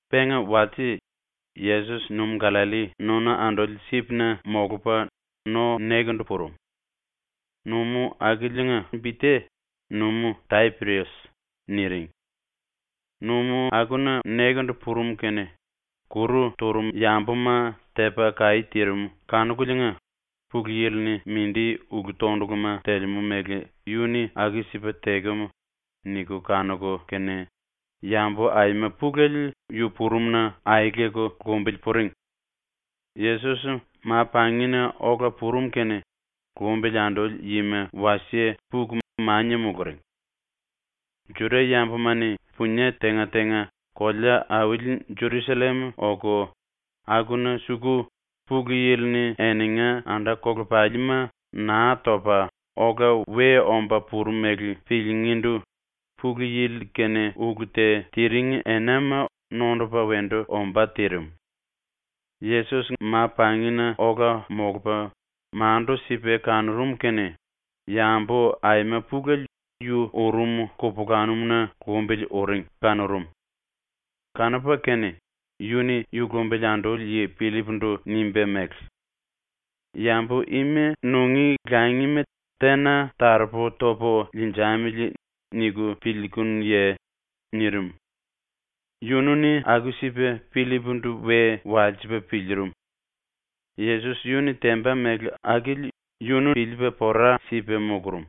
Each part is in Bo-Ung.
Penga walse Yesos Numú-Gallalli nona anduli sipna molupa no-nekendu purum. (Numú akiliinga bi te ‘Numú-Tapirias’ niring.) Numú akuna nekendu purum kene kuru turum yambuma tepa kaí tirim kanukuliinga ‘Pulu Yili-ni mindi ulu-tonduluma telemú mele yu-ni aku-sipa tekem.’ niku kanuku kene yambu aima pulele yu purumna aeleku lumbili puring. Yesos ma-pangina ola purum kene lumbili anduli yima wasie puku mania muluring. Juda-yambuma-ni ⸤punie tenga-tenga kolea-auli Jerusallem oku akuna suku⸥ Pulu Yili-ni eninga anda-kolepalima Naa Topa Ola We Omba Purum mele piliingíndu Pulu Yili-kene ulu te tiring enama nondupa wendu ombá tirim. Yesos ma-pangina ola molupa mandu-sipa kanurum kene yambu aima pulele yu urum kupulanum-na lumbili uring kanurum. Kanupa kene yu-ni yu lumbili anduli yi Pillip-ndu nimba mele: “Yambu ima nungí langima tena taropu topu liinjamili niku piliikunuye?” nirim. Yunu-ni aku-sipa Pillip-ndu we walsipa piliirim. Yesos yu-ni temba mele akili yunu piliipa pora sipa mulurum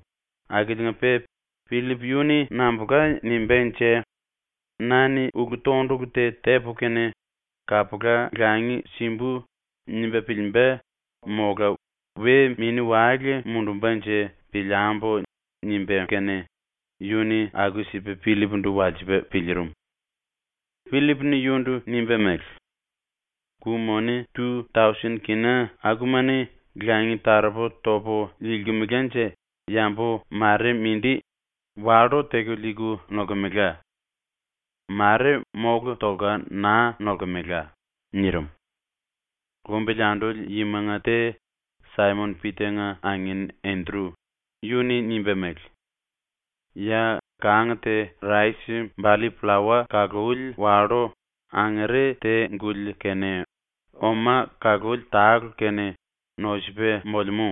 akiliinga-pe ‘Pillip yu-ni nambulka nimbánje? ‘Na-ni ulu-tondulu te tepu kene kapula langi simbu.’ nimba piliimba, mola we mini-wale mundumbanje piliambu.’ nimba kene yu-ni aku-sipa Pillip-ndu walsipa piliirim. Pillip-ni yundu nimba mele: “Ku-moni tu-tausen kina akuma-ni langi taropu topu liilkemelanje yambu mare mindi wallú-teku liiku nolkemela. Mare mólu tolka naa nolkemela.” nirim. Lumbili anduli yimanga te, Saimon-Pita-nga angin Endru, yu-ni nimba mele: “Ya kang te rais-balli pllawa kaluli wallú angere te-guli kene oma kaluli tale kene nosupa molemú.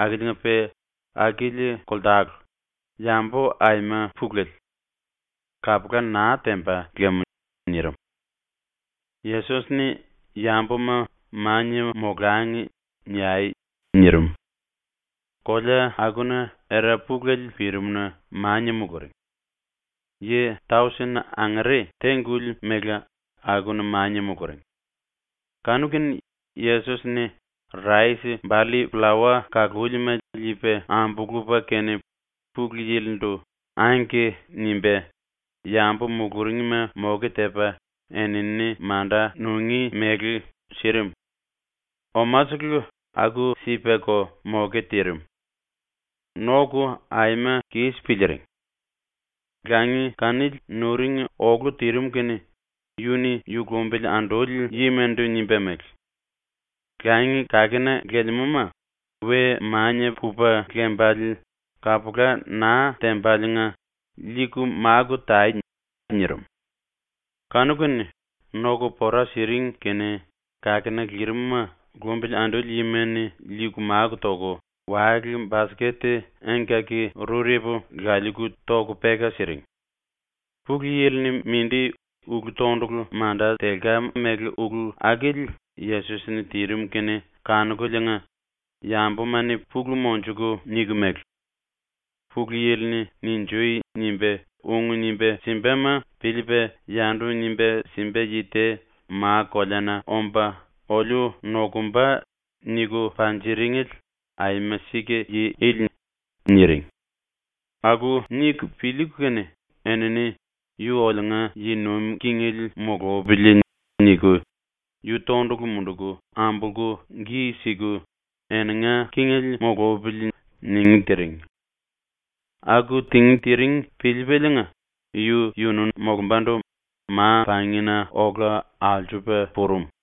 Akiliinga-pe akili koltale, yambu aima pulele. Kapula naa temba lam.” nirim. Yesos-ni “Yambuma “Mania molangi.” niai.” nirim. Kolea akuna era pulele pirim-na mania muluring. Yi tausen angere te-guli mele akuna mania muluring. Kanu-kene Yesos-ni rais-balli-pllawa kalúlima liipa ambulupa kene Pulu Yili-ndu “Angke” nimba yambu muluringma moke tepa enini manda nungí mele sirim. Omasele aku-sipako moke tirim. Noku ⸤aima⸥ kis piliiring. Langi kanili nuring olu tirim kene yu-ni yu lumbili anduli yimandu nimba mele: “Langi kakena lelemúma we mania pupa lembale kapula naa tembaliinga liiku máku tai.” nirim. Kanu-kene noku pora siring kene kakena lirim-ma lumbili anduli yima-ni liiku máku toku wale-basket engkaki-rurepu laliiku toku peka siring. Pulu Yili-ni mindi ulu-tondulu manda telka mele ulu akili Yesos-ni tirim kene kanukuliinga yambuma-ni pulu monjuku niku mele: “ “Pulu Yili-ni “Ninjui.” nimba, ung nimba simbama piliipa yandu nimba simba yi te ma-koleana omba oliu nokumba.” niku panjiringele aima sika yi ili.” niring. Aku niku piliiku kene enini ‘Yu oliunga yi nuim kingele mulupili.’ niku yu tondulu munduku ambolku gi siku ‘eninga kingele mulupili.’ ningí tiring. Aku tingí tiring piliipaliinga yu-yunu molumbandu ma-pangina ola alsupa purum.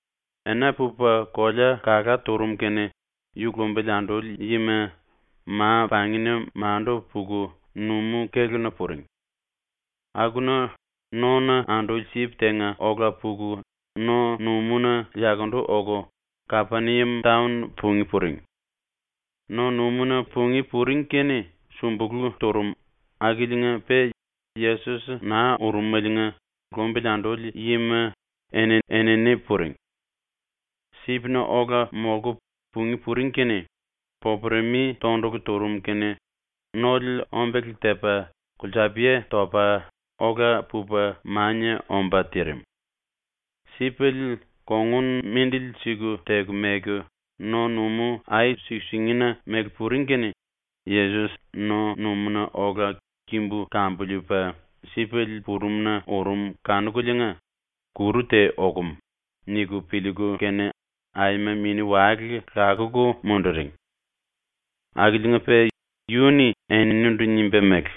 Ena pupa kolea kalá turum kene yu lumbili anduli yima ma-pangina mandu puku numú-kéluna puring. Akuna nona anduli sip tenga ola puku no-numúna yakundu oku Kapeniam taon pungí puring. No-numúna pungí puring kene súmbulu turum akiliinga-pe Yesos naa urumeliinga lumbili anduli yima eni-enini puring. ⸤Sipna ola molku pungí puring kene⸥ popuremi tondulu turum kene nole ombele tepa kulsapiye topa ola pupa mania omba tirim. Sipele kongun ⸤mindili-siku⸥ teku meku no-numú ai-suku-singina mele puring kene Yesos no-numúna ola kimbu kambiliipa sipele purumna urum kanukuliinga ‘Kuru te okum.’ niku piliiku kene aima mini-wale lakuku munduring. Akiliinga-pe yu-ni eninindu nimba mele: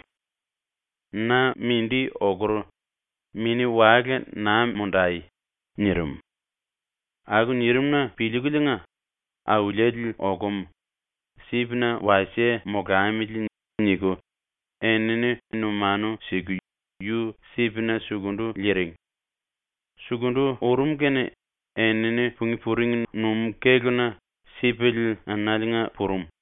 “Na mindi okur, mini-wale naa mundai.” nirim. Aku nirim-na piliikuliinga “⸤Auliele okum.⸥ Sipna wasie molamili.” niku enini numanu siku yu sipna sukundu liiring. Sukundu urum kene enini pungí puring numú-kéluna sipele enaliinga purum.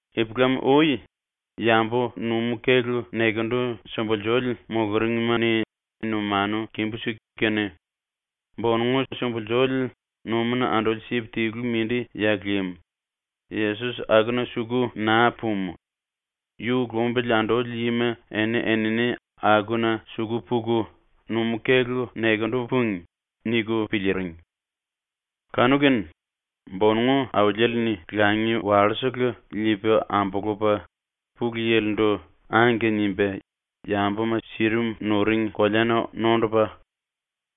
Ipulam-ui yambu numú-kélu nekendu sumbulsuli muluringma-ni numanu kimbú-siku kene, ‘Bonongu sumbulsuli numúna anduli sip tilu mindi ya lim, Yesos akuna suku naa pumu, yu lumbili anduli yima eni-enini akuna suku puku numú-kélu nekendu púngi.’ niku piliiring. Kanu-kene bonongu Auliele-ni langi wallú-sele liipa ambulupa Pulu Yili-ndu “Angke” nimba yambuma sirim nuring koleana nondupa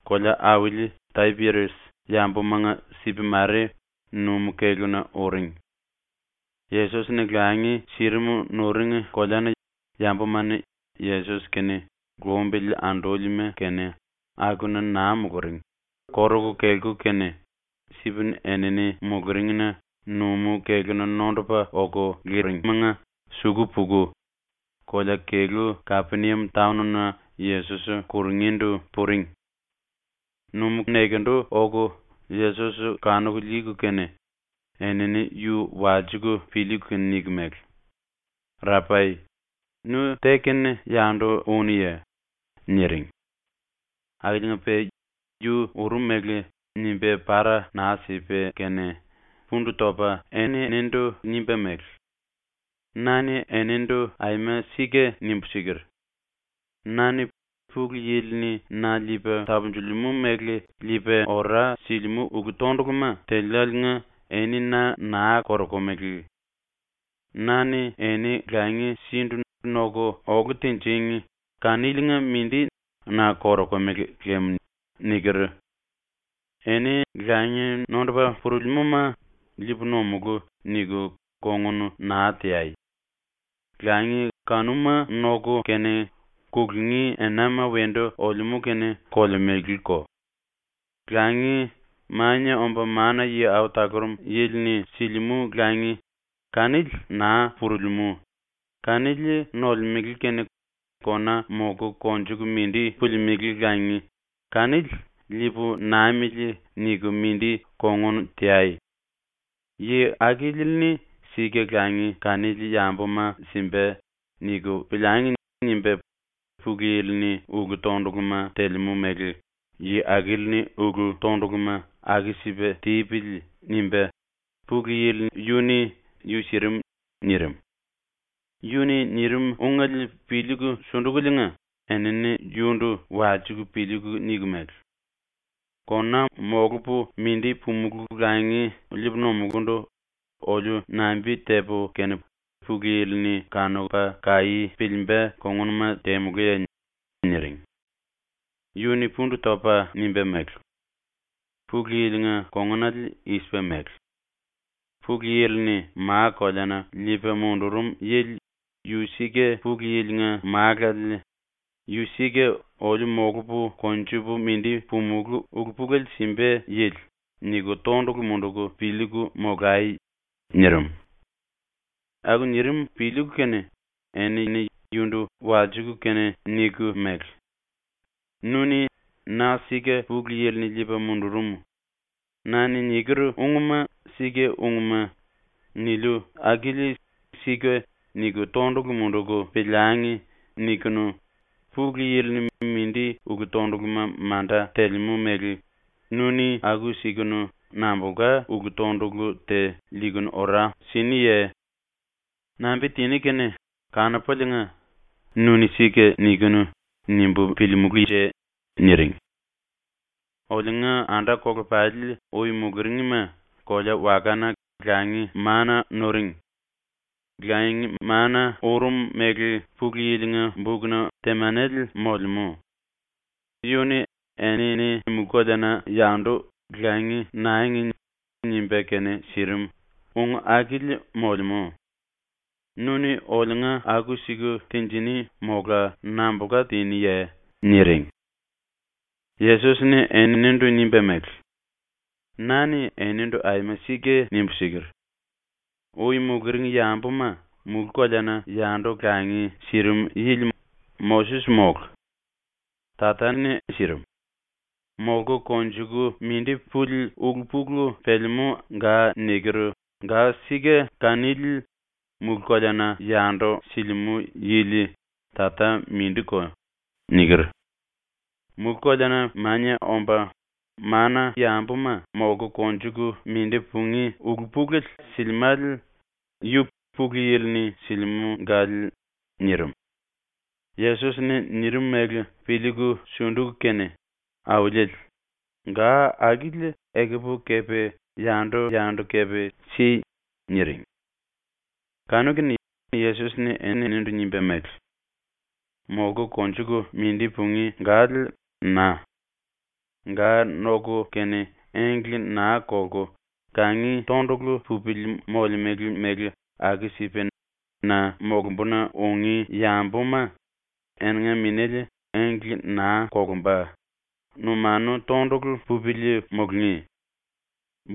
kolea-auli Tapirias yambumanga sip mare numú-kéluna uring. Yesos-ni langi sirim nuring koleana yambuma-ni Yesos kene lumbili andúlima kene akuna naa muluring koruku kelku kene sip enini muluringna numú-kéluna nondupa oku liringimanga suku puku kolea-kelú Kapeniam taon-na Yesos kurungíndu puring. Numú-nekendu oku Yesos kanuku liiku kene enini yu walsiku piliiku niku mele: “Rapai, nu te-kene yandu únuye?” niring. Akiliinga-pe ⸤yu urum mele nimba para naa sipa kene⸥ pundu topa eninindu nimba mele: “Na-ni enindu aima sika nimbu siker: “Na-ni ⸤Pulu Yili-ni na liipa tapunjilimú mele⸥ liipa ora silimú ulu-tonduluma teliáliinga eni na naa korokumele. Na-ni eni langi sindu noku olu tinjing kaniliinga mindi na korokumele lem.” niker. Eni langi nondupa purulimúma ‘Liipu nomulú.’ niku kongun naa teai. ⸤Langi kanuma noku kene, kulungí enama wendu olemú kene kolemeleko.⸥ Langi, Mania Omba Mana-Yi Au Talurum Yili-ni silimú langi, kanili naa purulimú, kanili nolemele kene kona molku konjuku mindi pulimelé langi kanili ‘Liipu namili.’ niku mindi kongun teai. ‘ ‘Yi akili-ni sika langi kanili yambuma simba.’ niku piliangi.’ nimba Pulu Yili-ni ulu-tonduluma telemú mele ‘Yi akili-ni ulu-tonduluma aku-sipa tipili.’ nimba Pulu Yili yu-ni yu sirim.” nirim. ⸤Yu-ni nirim ungele piliiku sundukuliinga,⸥ enini yundu walsiku piliiku niku mele: “⸤Kona molupu mindi pumulú langi liipu nomulundu⸥ oliu nambi tepu kene Pulu Yili-ni kanupa kaí piliimba kongunuma temulúye?” niring. Yu-ni pundu topa nimba mele: “Pulu Yili-nga kongunale i-sipa mele: ‘Pulu Yili-ni ma-koleana liipa mundurum yili yu sika Pulu Yili-nga Málale, ⸤yu sika oliu molupu konjupu mindi pumulú ulu-pulele simba yili⸥.’ niku tondulu munduku piliiku molai.” nirim. Aku nirim piliiku kene enini yundu walsiku kene niku mele: “Nu-ni ‘ “Na sika Pulu Yili-ni liipa mundurum. Na-ni niker ungma sika ungma.” niliu akili ‘Sika’ niku tondulu munduku piliangi.’ nikunu Pulu Yili-ni mindi ulu-tonduluma manda telemú mele nu-ni aku-sikunu nambulka ulu-tondulu te liiku ora siniye? Nambi tiní kene kanupuliinga ‘Nu-ni sika nikinu.’ nimbu piliimulúnje?” niring. “Oliunga anda-kolepali ui muluringma kolea-wakana langi-maana nuring. Langi-maana urum mele Pulu Yili-nga bukna temanele molemú: ‘Yu-ni ‘Enini mulú-koleana yandu langi nangi.’ nimba kene sirim.’ ung akili molemú. ⸤Nu-ni oliunga aku-siku tinjiní mola nambulka tiniye?⸥” niring. Yesos-ni eninindu nimba mele: “Na-ni enindu aima sika nimbu siker: “Ui muluring yambuma mulú-koleana yandu langi sirim yili Moses mólu. Tata-ni sirim. Molku konjuku mindi puli ulu-pulu pelemú ga niker ga-sika kanili mulú-koleana yandu silimú yili Tata mindiko.” niker. Mulú-koleana mania omba mana-yambuma molku konjuku mindi pungí ulu-pulele silimále yu Pulu Yili-ni silimú gale.” nirim. Yesos-ni nirim mele piliiku sunduku kene, “Auliele, ga akili ekupu kepe yandu-yandu kepe si.” niring. Kanu-kene Yesos-ni eninindu nimba mele: “Molku konjuku mindi pungí gale na. ⸤Ga noku kene engle naa kolku kangi tondulu pupili molemele mele aku-sipa⸥ na molumbuna ungí yambuma eninga minéle engle naa kolumba, numanu tondulu pupili mulungí.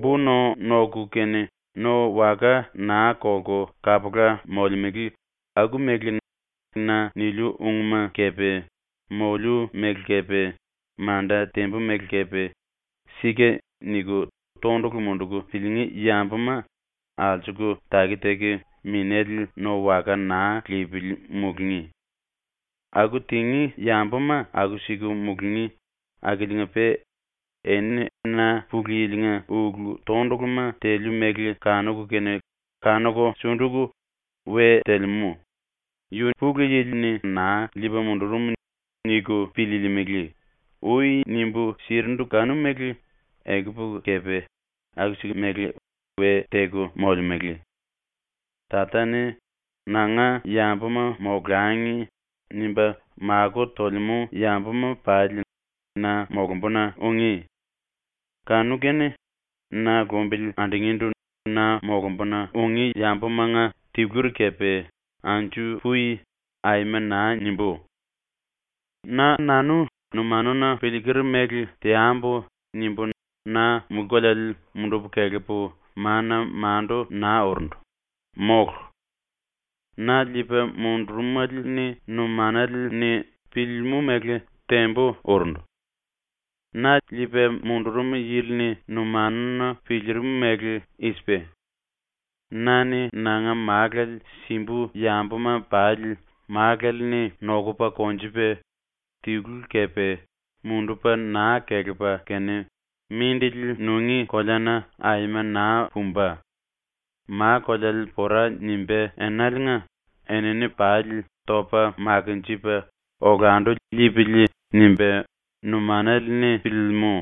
Bo-no noku kene no waka naa kolku kapula molemele aku-mele na niliu ungma kepe moliu mele kepe manda tembu mele kepe ‘Sika’ niku tondulu munduku piliingí yambuma alsuku taki-taki minéle no waka naa lipili mulungí. Aku tingí yambuma aku-siku mulungí akiliinga-pe “Eni na ⸤Pulu Yili-nga ulu-tonduluma teliu mele⸥ kanuku kene kanuku sunduku ‘We telemú. Yu Pulu Yili-ni naa liipa mundurum.’ niku piliilimili.” ui nimbu sirindu kanu-mele ekupu kepe aku-siku mele we teku molemele. Tata-ni ‘Nanga yambuma molangi.’ nimba makó tolemú yambuma pali na molumbuna ungí. Kanu-kene na lumbili andungíndu na molumbuna ungí yambumanga tiluri kepe “Anju pui.” aima naa nimbú. “‘Na-nanu numanuna piliiker mele teambu.’ nimbu na mulú-koleale mundupu kelepu mana-mandu naa urundu, mólu. Na liipa mundurumele-ni numanale-ni piliilimú mele tembu urundu. Na liipa mundurum yili-ni numanuna piliirim mele i-sipa: ‘Na-ni ⸤nanga Málale⸥ simbu yambuma pali ⸤Málale-ni⸥ nokupa konjupa, tilu kepe mundupa naa kelepa kene mindili nungí koleana aima naa pumba, ma-koleale pora nimbá enaliinga enini pali topa makinjipa olandu liipili.’ nimba numanale-ni piliilimú.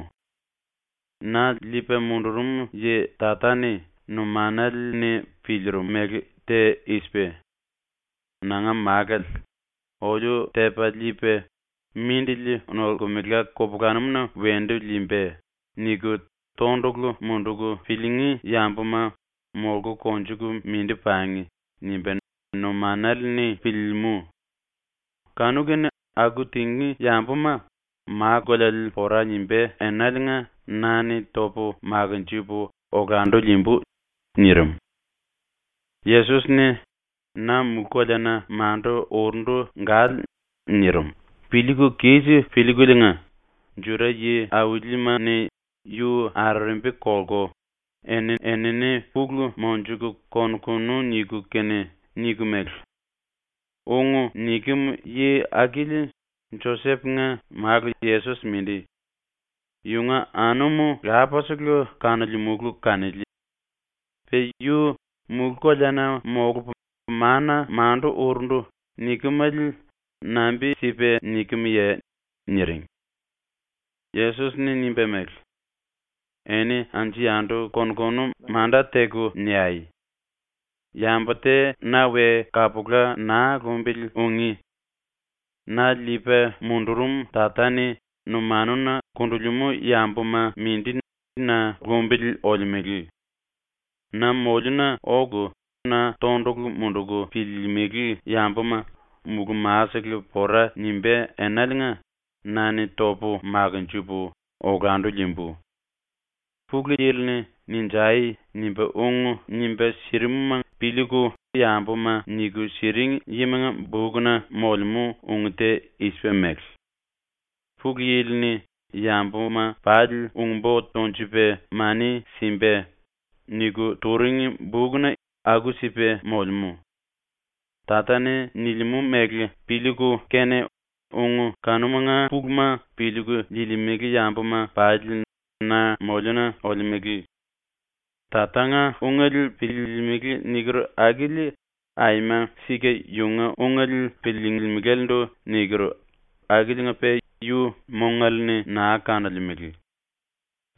Na liipa mundurum yi Tata-ni numanale-ni piliirim mele te i-sipa: ‘Nanga Málale ‘oliu tepa liipa, mindili nolkemela kupulanumuna wendu liimba.’ niku tondulu munduku piliingí yambuma molku konjuku mindi pangi.’ nimba numanale-ni piliilimú. Kanu-kene aku tingí yambuma ma-koleale pora nimbá enaliinga na-ni topu makinjipu olandu liimbu.” nirim. Yesos-ni “Na mulú-koleana mandu urundu gale.” nirim piliiku kis piliikuliinga Juda yi-aulima-ni yu arerembi kolku eni-enini pulu monjuku kon-konu niku kene niku mele: “Ung nikem yi akili Josep-nga málu Yesos mindi. Yunga anum lapasele kanolemulu kanili. Pe yu “Mulú-koleana molupu mana-mandu urundu.” nikemale nambi-sipa nikemye?” niring. Yesos-ni nimba mele: “Eni anju-yandu kon-konu manda-teku niai! Yambu te na we kapula naa lumbili ungí. Na liipa mundurum Tata-ni numanuna kundulimú yambuma mindi na lumbili olemele. Na moliuna oku na tondulu munduku piliilimili yambuma mulú-ma-sele pora nimbá enaliinga na-ni topu makinjipu olandu liimbu. Pulu Yili-ni “Ninjai.” nimba ung nimba sirimuma piliiku yambuma niku siring yimanga bukna molemú ung te i-sipa mele: “Pulu Yili-ni yambuma pali ung-bo tonjupa mani simba.” niku turing bukna aku-sipa molemú. Tata-ni nilimú mele piliiku kene ung kanumanga puluma piliiku liilimele yambuma pali na moliuna olemele. Tatanga ungele piliilimili niker akili aima sika yunga ungele piliilimilalendu niker akiliinga-pe yu mongale-ni naa kanolemele.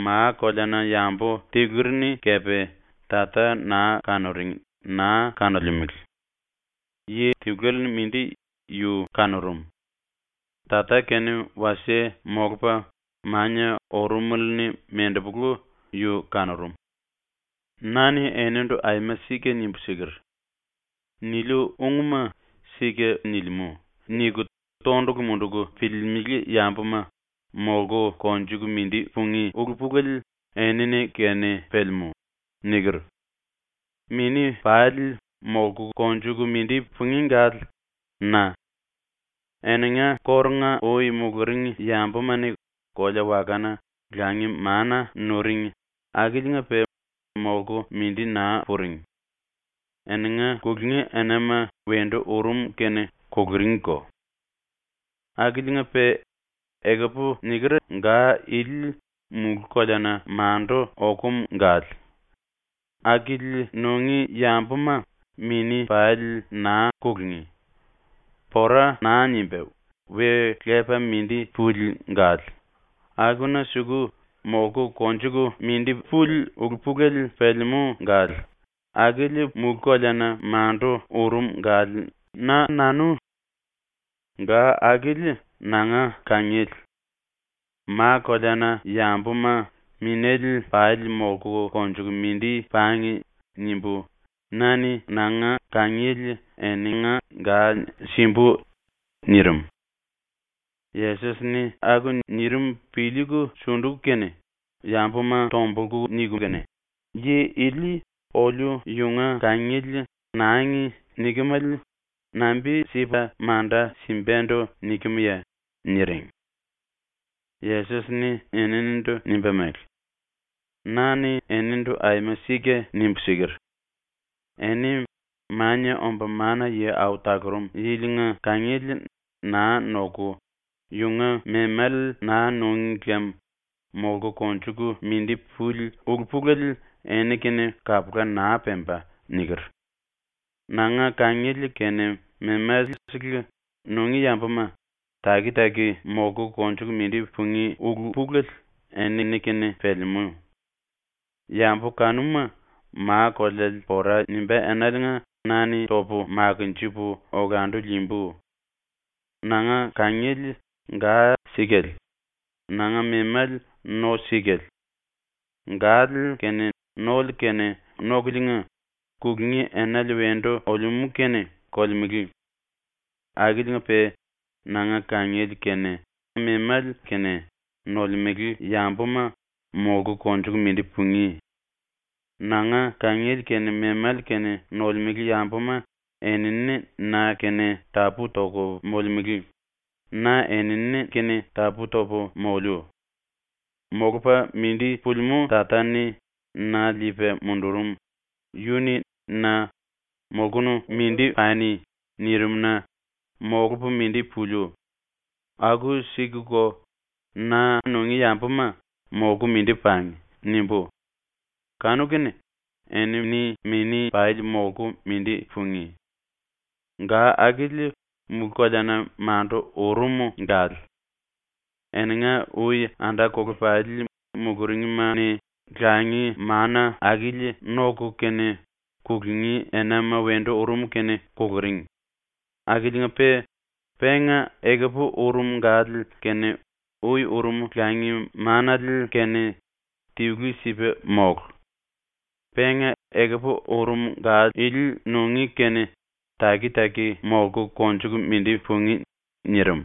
Ma-koleana-yambu tiluri-ni kepe Tata naa kanuring naa kanolemele. Yi tiluele-ni mindi yu kanurum. Tata-kene wasie molupa mania urumele-ni mendepolu yu kanurum. “Na-ni enindu aima sika nimbu siker: “⸤Niliu ungma⸥ ‘Sika nilimú.’ niku tondulu munduku piliilimili yambuma molku konjuku mindi pungí ulu-pulele enini-kene pelemú.” niker. Mini pali molku konjuku mindi pungí gale na. Eninga kórunga-ui muluring yambuma-ni kolea-wakana langi-maana nuring akiliinga-pe molku mindi naa puring. Eninga kulungí enama wendu urum kene kuluringko. “Akiliinga-pe ekupu niker ga ili mulú-koleana mandu okum gale. Akili nungí yambuma mini pali naa kulungí. Pora naa nimba we lepa mindi puli gale, akuna suku molku konjuku mindi puli ulu-pulele pelemú gale, akili mulú-koleana mandu urum gale na. Ga akili nanga kangiele. ‘Ma-koleana-yambuma, minéle pali molku konjuku mindi pangi.’ nimbu na-ni nanga kangiele eninga gale simbu.” nirim. ⸤Yesos-ni aku nirim piliiku sunduku kene,⸥ yambuma tombulku niku kene, “Yi ili oliu yunga kangiele “Nangi.” nikemale nambi-sipa manda simbandu nikemye?” niring. Yesos-ni eninindu nimba mele: “Na-ni enindu aima sika nimbu siker: “Eni Mania Omba Mana-Yi Au Talurum Yili-nga kangiele naa noku yunga memale naa núngi lem molku konjuku mindi puli ulu-pulele eni-kene kapula naa pemba.” niker. Nanga kangiele kene memale-sele nungí yambuma taki-taki molku konjuku mindi pungí ulu-pulele enini-kene pelemú. Yambu kanuma ma-koleale pora nimbá enaliinga na-ni topu makinjipu olandu liimbu. “Nanga kangiele ga-sikale; nanga memale no-sikale. Gale kene nole kene nokuliinga, kulungí enale wendu olemú kene kolemele. Akiliinga-pe nanga kangiele kene memale kene nolemele yambuma molku konjuku mindi pungí. Nanga kangiele kene memale kene nolemele yambuma enini na-kene tapú-toku molemele, na enini-kene tapú-topu moliu. Molupa mindi pulimú Tata-ni na liipa mundurum, yu-ni na ‘Molkunu mindi pani.’ nirim-na molupu mindi puliu, aku-sikuko na nungí yambuma ‘Molku mindi pangi.’ nimbú, kanu-kene enini mini pali molku mindi pungí. Ga akili mulú-koleana mandu urum gale. Eninga ui anda-kolepali muluringma-ni langi-maana akili noku kene ⸤kulungí enama wendu urum kene⸥ kuluring, akiliinga-pe penga ekupu urum gale kene ui urum langi-maanale kene tilu-sipa mólu. Penga ekupu urum ga ili nungí kene taki-taki molku konjuku mindi pungí.” nirim.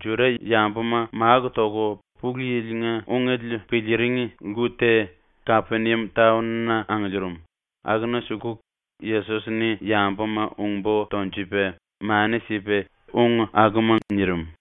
Juda-yambuma máku toku Pulu Yili-nga ungele piliiring lku te, Kapeniam taon-na angiliirim, akuna suku Yesos-ni yambuma ung-bo tonjupa mani sipa ung akuma nirim.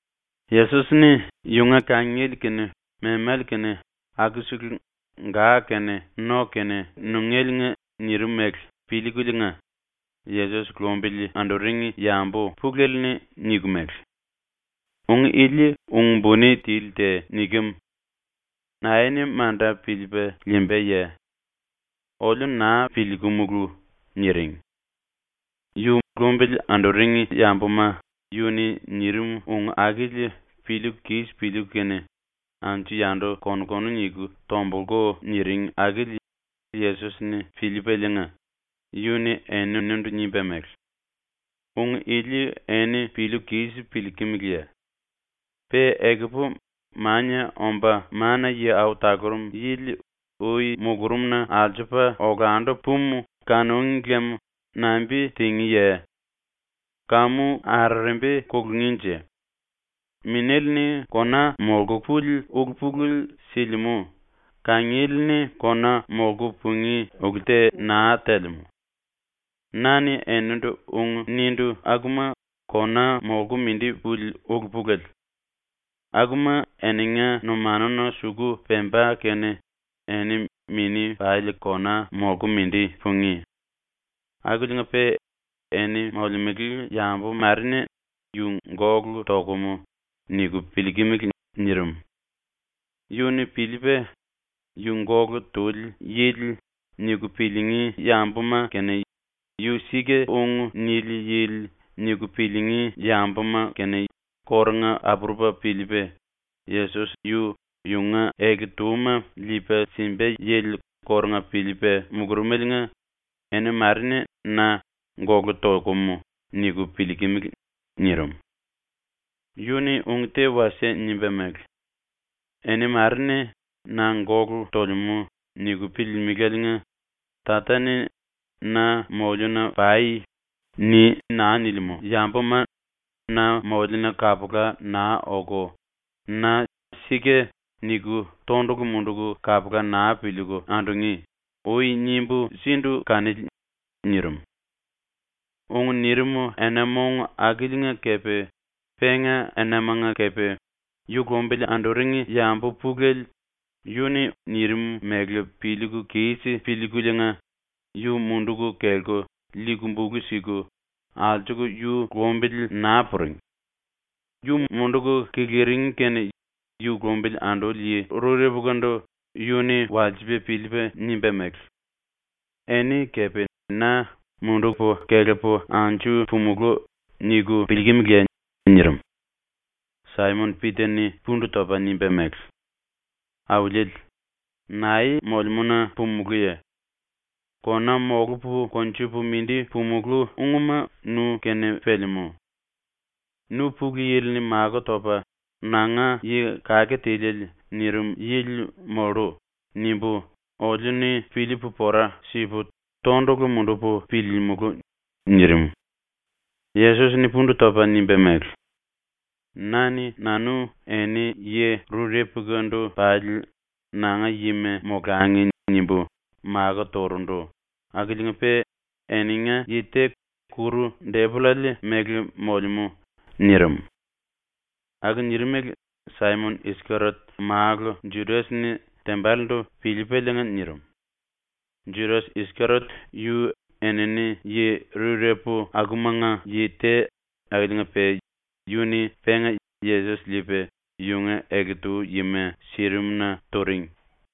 Yesos-ni ⸤yunga kangiele kene memale kene akusele ga kene no kene nungéliinga⸥ nirim mele piliikuliinga Yesos lumbili anduring yambu pulele-ni niku mele: “Ung ili ung-buni tili te nikem. Nae-ni manda piliipa liimbaye? Oliu naa piliikumulu.” niring. Yu lumbili anduring yambuma yu-ni nirim ung akili piliiku kis piliiku kene anju-yandu kon-konu niku tombulku niring akili Yesos-ni piliipaliinga, yu-ni eninindu nimba mele: “Ung ili eni piliiku kis piliikimiliye? Pe ekupu Mania Omba Mana-Yi Au Talurum Yili ui mulurumna alsupa olandu pumu kanúngi lem nambi tingíye? ⸤Kamu arerembi kulungínje?⸥ “Minéle-ni kona molku puli ulu-pulele silimú; kangiele-ni kona molku pungí ulu te naa telemú. Na-ni enindu ung nindu akuma kona molku mindi puli ulu-pulele. Akuma eninga numanuna suku pemba kene eni mini pali kona molku mindi pungí. Akiliinga-pe eni molemele yambu mare-ni ‘yu gólu tokum.’ niku piliikimili.” nirim. Yu-ni piliipa ‘Yu gólu tuli yili.’ niku piliingí yambuma kene ‘Yu sika-ung nili yili.’ niku piliingí yambuma kórunga apurupa piliipa, Yesos yu yunga ele-túma liipa simba yili kórunga piliipa mulurumeliinga “Eni mare-ni na ‘Gólu tokum.’ niku piliikimili.” nirim. Yu-ni ung te wasie nimba mele: “Eni mare-ni na ‘Gólu tolemú.’ niku piliilimiláliinga ‘Tata-ni “Na moliuna pai.” ni naa nilimú yambuma na moliuna kapula naa oku, na “Sika” niku tondulu munduku kapula naa piliiku andungí.’ ui nimbu sindu kanili.” nirim. Ung nirim ena-mong akiliinga kepe penga enamanga kepe yu lumbili anduring yambu pulele yu-ni nirim mele piliiku kis piliikuliinga yu munduku kelku liiku bulu siku alsuku yu lumbili naa puring. Yu munduku kiliring kene yu lumbili anduli yi rurepukandu yu-ni walsipa piliipa nimba mele: “Eni kepe na ‘Mundupu kelepu anju pumulú.’ niku piliikimiliye?” nirim. Saimon-Pita-ni pundu topa nimba mele: “Auliele, nae molemúna pumulúye? Kona molupu konjupu mindi pumulú ungma nu-kene pelemú. ‘Nu Pulu Yili-ni makó topa ‘Nanga Yi Kake Tiliele.’ nirim yili mollu.’ nimbu oliu-ni piliipu pora sipu tondulu mundupu piliilimulu.” nirim. Yesos-ni pundu topa nimba mele: “Na-ni nanu eni yi rurepukandu pali ‘Nanga yima molangi.’ nimbu makó turundu akiliinga-pe eninga yi te ⸤kuru-⸥depollale mele molemú.” nirim. (Aku nirimele Saimon-Iskeriot málu Judas-ni tembalendu piliipaliinga nirim. Judas-Iskeriot yu enini yi rurepu akumanga yi te akiliinga-pe yu-ni penga Yesos liipa yunga ele-tu yima sirim-na turing.)